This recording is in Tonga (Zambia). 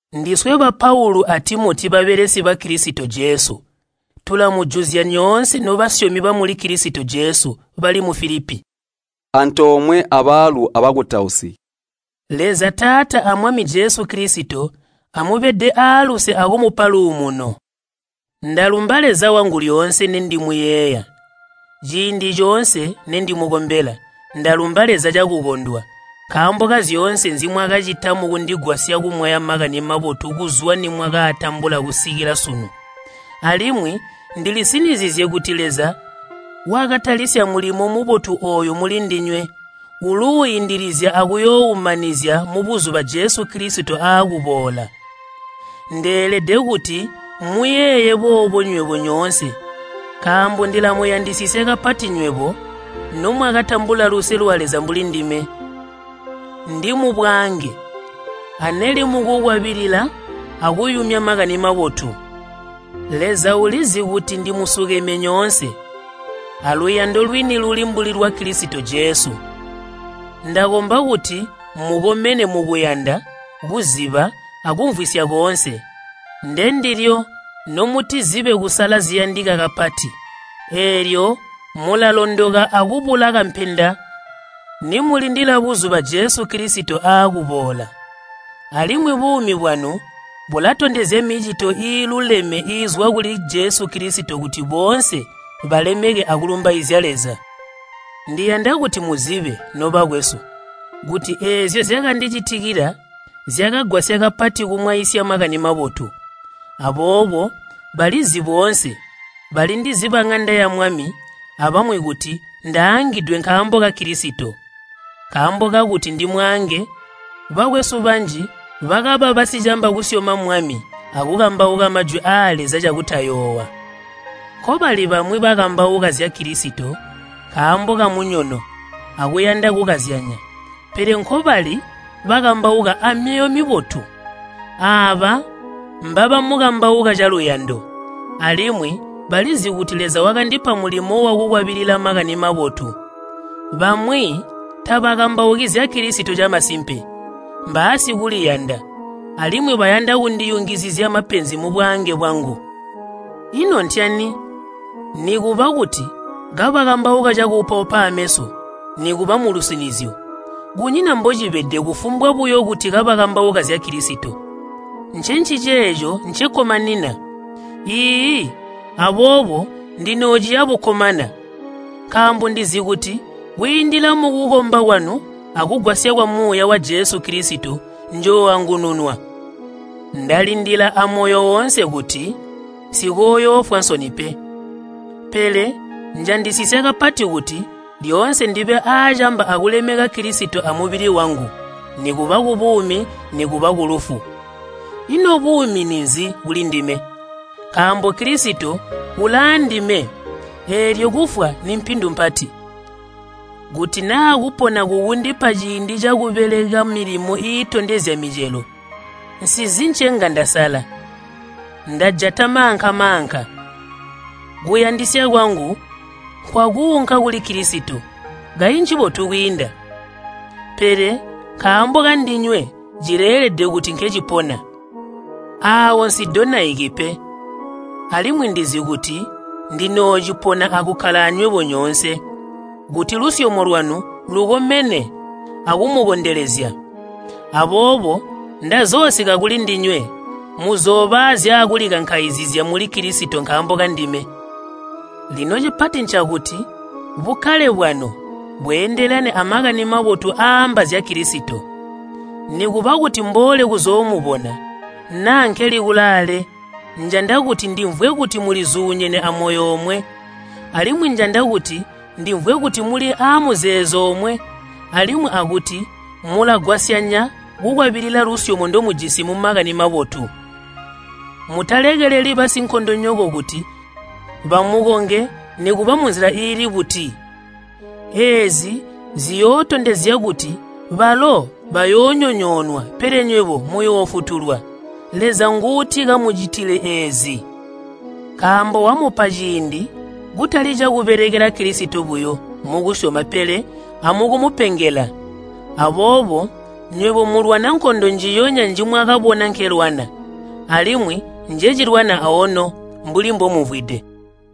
Ndiswe ba Paulu a Timoti babelesi ba Kilisito Jesu, tulamujuzya nyoonse nobasyomi bamuli Kilisito Jesu, bali mu Filipi, antoomwe abaalu abakutausi. Leza Taata a Mwami Jesu Kilisito amubede aaluse akumupa luumuno. Ndalumba Leza wangu lyoonse nendimuyeeya. Ciindi coonse nendimukombela, ndalumba Leza cakukondwa, nkaambo kazyoonse nzimwakacita mukundigwasya kumwaya Makani Mabotu kuzwa nimwakaatambula kusikila sunu. Alimwi ndilisinizizye kuti Leza wakatalisya mulimo mubotu ooyu mulindinywe uluuindilizya akuyooumanizya mubuzuba Jesu Kilisito aakuboola. Ndeelede kuti mmuyeeye boobo nywebo nyoonse nkaambo ndilamuyandisisya kapati nywebo nomwakatambula luse lwa Leza mbulindime, ndi mubwaange aneli mukukwabilila akuyumya Makani Mabotu. Leza ulizi kuti ndimusukeme nyoonse aluyando lwini luli mbuli lwa Kilisito Jesu. Ndakomba kuti mukomene mukuyanda, kuziba, akumvwisya koonse. Ndendilyo nomutizibe kusala ziyandika kapati, eelyo mulalondoka akubula kampenda nimulindila buzuba Jesu Kilisito aakuboola. Alimwi buumi bwanu bulatondezya micito iiluleme iizwa kuli Jesu Kilisito kuti boonse balemeke akulumbaizya Leza. Ndiyanda kuti muzibe, nobakwesu, kuti eezyo zyakandicitikila zyakagwasya kapati kumwaisya Makani Mabotu. Aboobo balizi boonse balindizi baŋanda yamwami abamwi kuti ndaangidwe nkaambo ka Kilisito. Nkaambo kakuti ndimwaange, bakwesu banji bakaba basicamba kusyoma Mwami akukambauka Majwi aa Leza cakutayoowa. Nkobali bamwi bakambauka zya Kilisito nkaambo kamunyono akuyanda kukazyanya, pele nkobali bakambauka amyoyo mibotu. Aaba mbabamukambauka caluyando, alimwi balizi kuti Leza wakandipa mulimo wakukwabilila Makani Mabotu. Bamwi tabakambauki zya Kilisito camasimpe. Mbaasikuliyanda alimwi bayanda kundiyungizizya mapenzi mubwaange bwangu. Ino ntyani? Nikuba kuti kabakambauka cakuupaupa aameso nikuba mulusinizyo, kunyina mbocibede kufumbwa buyo kuti kabakambauka zya Kilisito. Ncenciceeco ncekkomanina. Iiyi, aboobo ndinoociya bukkomana. Nkaaambo ndizi kuti kwiindila mukukomba kwanu akugwasya kwa Muuya wa Jesu Kilisito njooangununwa. Ndalindila amoyo woonse kuti nsikooyoofwa nsoni pe. Pele njandisisya kapati kuti lyoonse ndibe aacamba akulemeka Kilisito amubili wangu, nikuba kubuumi nikuba kulufu. Ino buumi ninzi kulindime? Nkaambo Kilisito ulaandime, eelyo kufwa nimpindu mpati. Kuti naa kupona kukundipa ciindi cakubeleka milimo iitondezya micelo, nsizi ncenga ndasala. Ndajata maanka-maanka. Kuyandisya kwangu nkwakuunka kuli Kilisito, kayi ncibotu kwiinda! Pele nkaambo kandinywe cileelede kuti nkecipona. Aawo nsidonaiki pe, alimwi ndizi kuti ndinoocipona akukkala anywebo nyoonse, kuti lusyomo lwanu lukomene akumukondelezya. Aboobo ndazoosika kulindinywe, muzooba aazyakulikankaizizya muli Kilisito nkaambo kandime. Lino cipati ncakuti bukkale bwanu bweendelane a Makani Mabotu aaamba zya Kilisito. Nikuba kuti mboole kuzoomubona, naa nkeli kulaale, njanda kuti ndimvwe kuti mulizuunyene amoyo omwe. Alimwi njanda kuti ndimvwe kuti muli aamuzeezo omwe alimwi akuti mulagwasyanya kukwabilila lusyomo ndomujisi mu Makani Mabotu. Mutalekeleli basinkondonyoko kuti bamukonge nikuba munzila iili buti. Eezi ziyootondezya kuti balo bayoonyonyoonwa pele nywebo muyoofutulwa. Leza nguutikamucitile eezi, nkaambo wamupa ciindi kutali cakubelekela Kilisito buyo mukusyoma pele amukumupengela. Aboobo nywebo mulwana nkondo njiyonya njimwakabona nkelwana, alimwi njecilwana aono mbuli mbomumvwide.